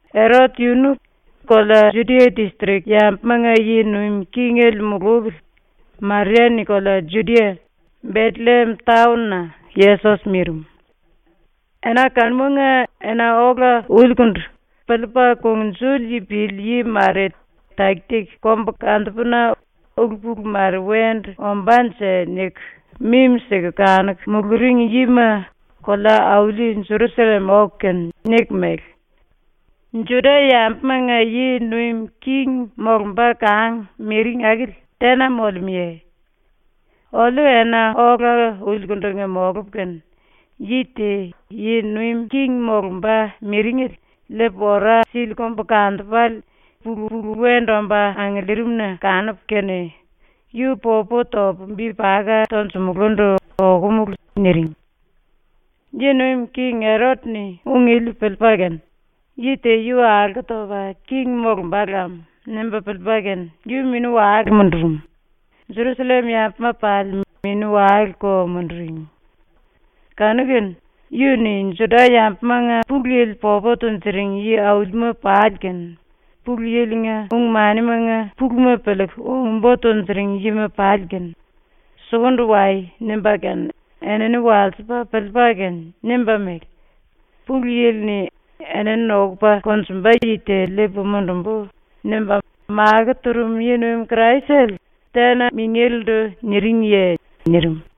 Erot yunu kolea Judia distrik yambumanga yi nuim kingele mulupili Maria-ni kolea Judia, Betelliem taon-na Yesos mirim. Ena kanumanga ena ola ulikundu piliipa kungnjuli pili yi mare taki-taki kombukantupuna ‘ulu-pulu mare wendu ombánje?’ niku mimi-siku kanuku muluring yima kolea-auli Jerusallem oku kene niku mele: “Juda-yambumanga yi nuim king molumba kang miring akili tena molemúye? Oliu ena ola ulikundu molupu kene yi te yi nuim king molumba miringele liipa ora sili kombukantupale pulu-pulu wendu omba angiliirim-na kanupu kene, yu popu topu bi paka tonjumulundu okomulu.” niring. Yi nuim king Erot-ni ung ili piliipa kene ‘Yi te yu alko topa king molumba lam.’ nimba piliipa kene yu mini-wale mundurum, Jerusallem yambuma pali mini-waleko munduring. Kanu-kene yu-ni Juda-yambumanga Pulu Yili popu tunjuring yi-aulima pali kene Pulu Yili-nga ung-manimanga puluma piliiku ung-bo tunjuring yima pali kene “Sukundu wai.” nimba kene enini walsipa piliipa kene nimba mele: “Pulu Yili-ni ‘Enini nokupa konjumba yi te liipu mundumbu.’ nimba makó turum yi-nuim Kraisele tena mingélendu niringiye?” nirim.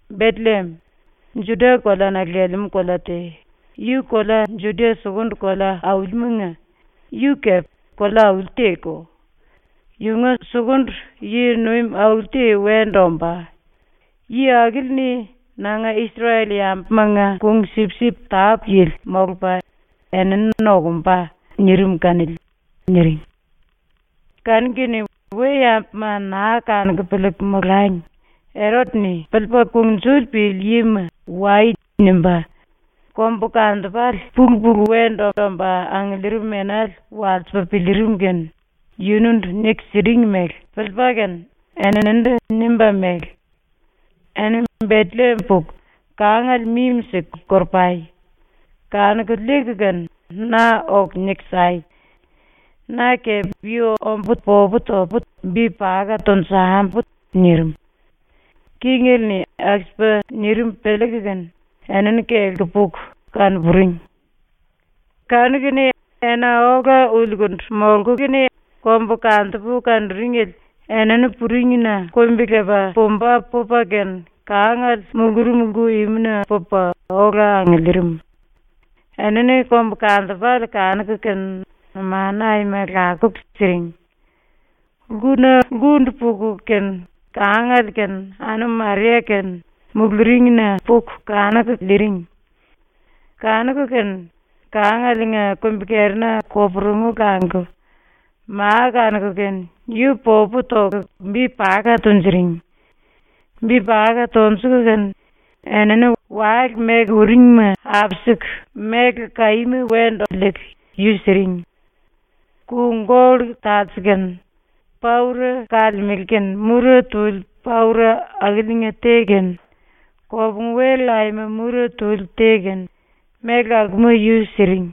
“Betelliem, Juda koleana lelemú kolea te, yu kolea Juda sukundu kolea-aulimanga yu kolea kepe auli te-ko. Yunga sukundu yi-nuim auli te wendu ombá, yi akili-ni nanga Isrel-yambumanga kung-sipsip tápu-yili molupa enini nokumba.” nirim kanili.” niring. Kanu-kene we-yambuma naa kanuku piliiku molangi Erot-ni piliipa kungnjuli pili yima “Wai.” nimba kombukantupale pulu-pulu wendu omba angiliirim enale walsipa piliirim kene yunundu niku siring mele piliipa kene eninindu nimba mele: “Eni Betelliem puku kangale mimi-siku koro-pai! Kanuku liiku kene na oku niku sai. Na kepe yu ombu popu topu bi paka tonjambu.” nirim. Kingele-ni aku-sipa nirim piliiku kene enini kelku puku kano-puring. Kanu-kene ena ola ulikundu molku kene kombukantupu kanuringele enini puringna kumbi-lepa pumba pupa kene kangale mulurum lku-imuna pupa ola angiliirim. Enini kombukantupale kanuku kene numanu aima lakuku siring. Lkuna lkundu puku kene kangale kene anum Maria kene muluringlina puku kanuku liiring. Kanuku kene kangalenga kumbi-kerina koporungu languku ma kanuku kene yu popu toku bi paka tunjuring. Bi paka tonjuku kene enini wale meku uringma apisiku méle kaíma wendu liiku yu siring. Ku-gollu talse kene, paura kalemele kene mura tuli paura akiliinga te kene, kopungu-wel aima mura tuli te kene, méle akuma yu siring.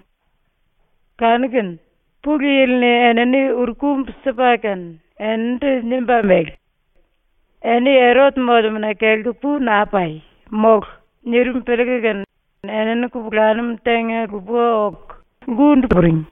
Kanu-kene Pulu Yili-ni enini uru-kumbu sipa kene eninindu nimba mele: “Eni Erot molemúna kelku pu naa pai, mólu!” nirim piliiku kene enini kupulanum tenga-lupa oku lkundu puring.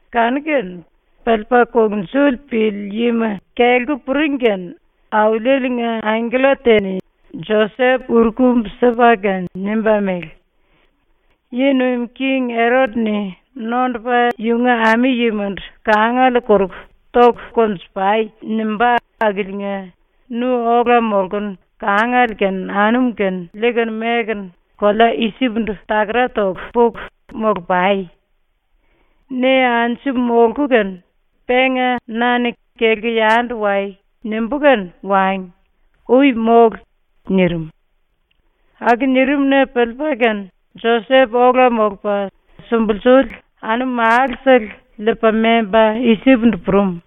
Kanu-kene piliipa kungnjuli pili yima kelku puring kene Auliele-nga angkella te-ni Josep uru-kumbu sipa kene nimba mele: “Yi nuim king Erot-ni nondupa yunga ami-yimandu ‘Kangale koruku toku konju-pai!’ nimbá akiliinga nu ola molkunu kangale kene anum kene liikunu mekunu kolea Isip-ndu takara toku puku molu-pai. Ne anju molku kene, penga na-ni ‘Kelku yandu wai.’ nimbú kene wangi. Ui mólu.” nirim. Aku nirim-na piliipa kene Josep ola molupa sumbulsuli anum-málusele liipa memba Isip-ndu purum.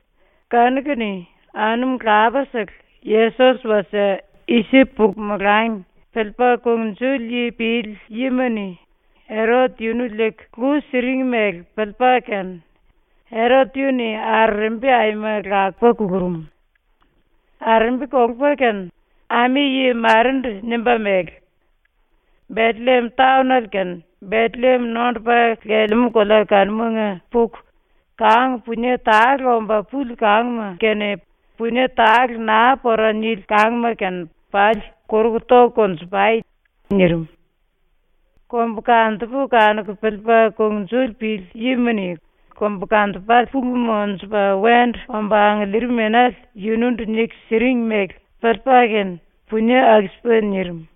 Kanu-kene anum lapasele Yesos wasie Isip puku molangi, piliipa kungnjuli pili yima-ni Erot yunu liiku lu siring mele piliipa kene Erot yu-ni arerembi aima lakupa kulurum. Arerembi kolupa kene ami-yi marendu nimba mele: “Betelliem taonale kene Betelliem nondupa lelemú kolea kanumanga puku kang punie tale omba puli kangma kene punie tale naa pora nili kangma kene pali koruku toku konju-pai!” nirim. Kombukantupu kanuku piliipa kungnjuli pili yima-ni kombukantupale pulu monjupa wendu omba angiliirim enale yunundu niku siring mele piliipa kene punie aku-sipa nirim.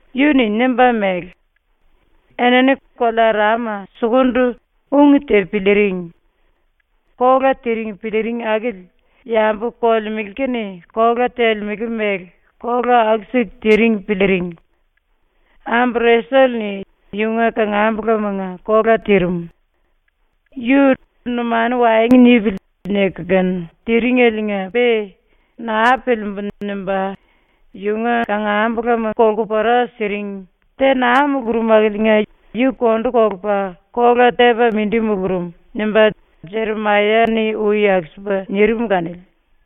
Yu-ni nimba mele: “Enini kolea Rama sukundu ung te piliiring; kola tiring piliiring akili, yambu kolemele kene kola telemele mele kola aku-siku tiring piliiring. Ambu Resel-ni yunga kangambulamanga kola tirim. Yu ‘Numanu waengu nipili.’ niku kene tiringeliinga-pe ‘Naa piliimbu.’ nimba yunga kangambulama kolku pora siring, te naa mulurum akiliinga yu kondu kolupa kola tepa mindi mulurum.” nimba Jeremaya-ni ui aku-sipa nirim kanili.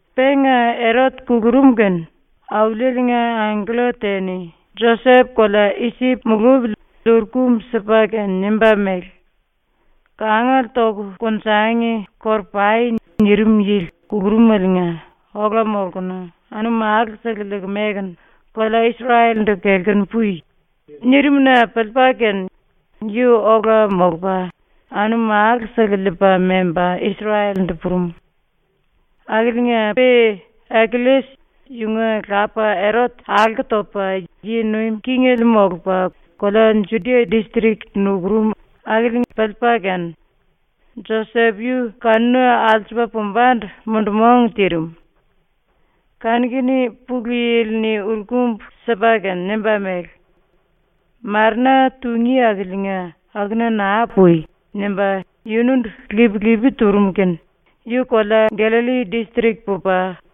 Penga Erot kulurum kene Auliele-nga angkella te-ni Josep kolea Isip mulupili uru-kumbu sipa kene nimba mele: “‘Kangale toku konjangi koro-pai.’ nirim yili kulurumeliinga ola molkunu anum málu-sele liiku mekunu kolea Isrel-ndu kelkunu pui.” nirim kene-na piliipa kene yu ola molupa anum málu-sele liipa memba Isrel-ndu purum. Akiliinga-pe Akelles yunga lapa Erot alko topa yi nuim kingele molupa kolea Judia distrik nukurum akili piliipa kene Josep yu kanuna alsupa pumbandu mundu-mong tirim. Kanu-kene Pulu Yili-ni uru-kumbu sipa kene nimba mele: “Marena tungí akiliinga akuna naa pui.” nimba yunundu lip-lipi turum kene yu kelepa kolea Gallalli distrik pupa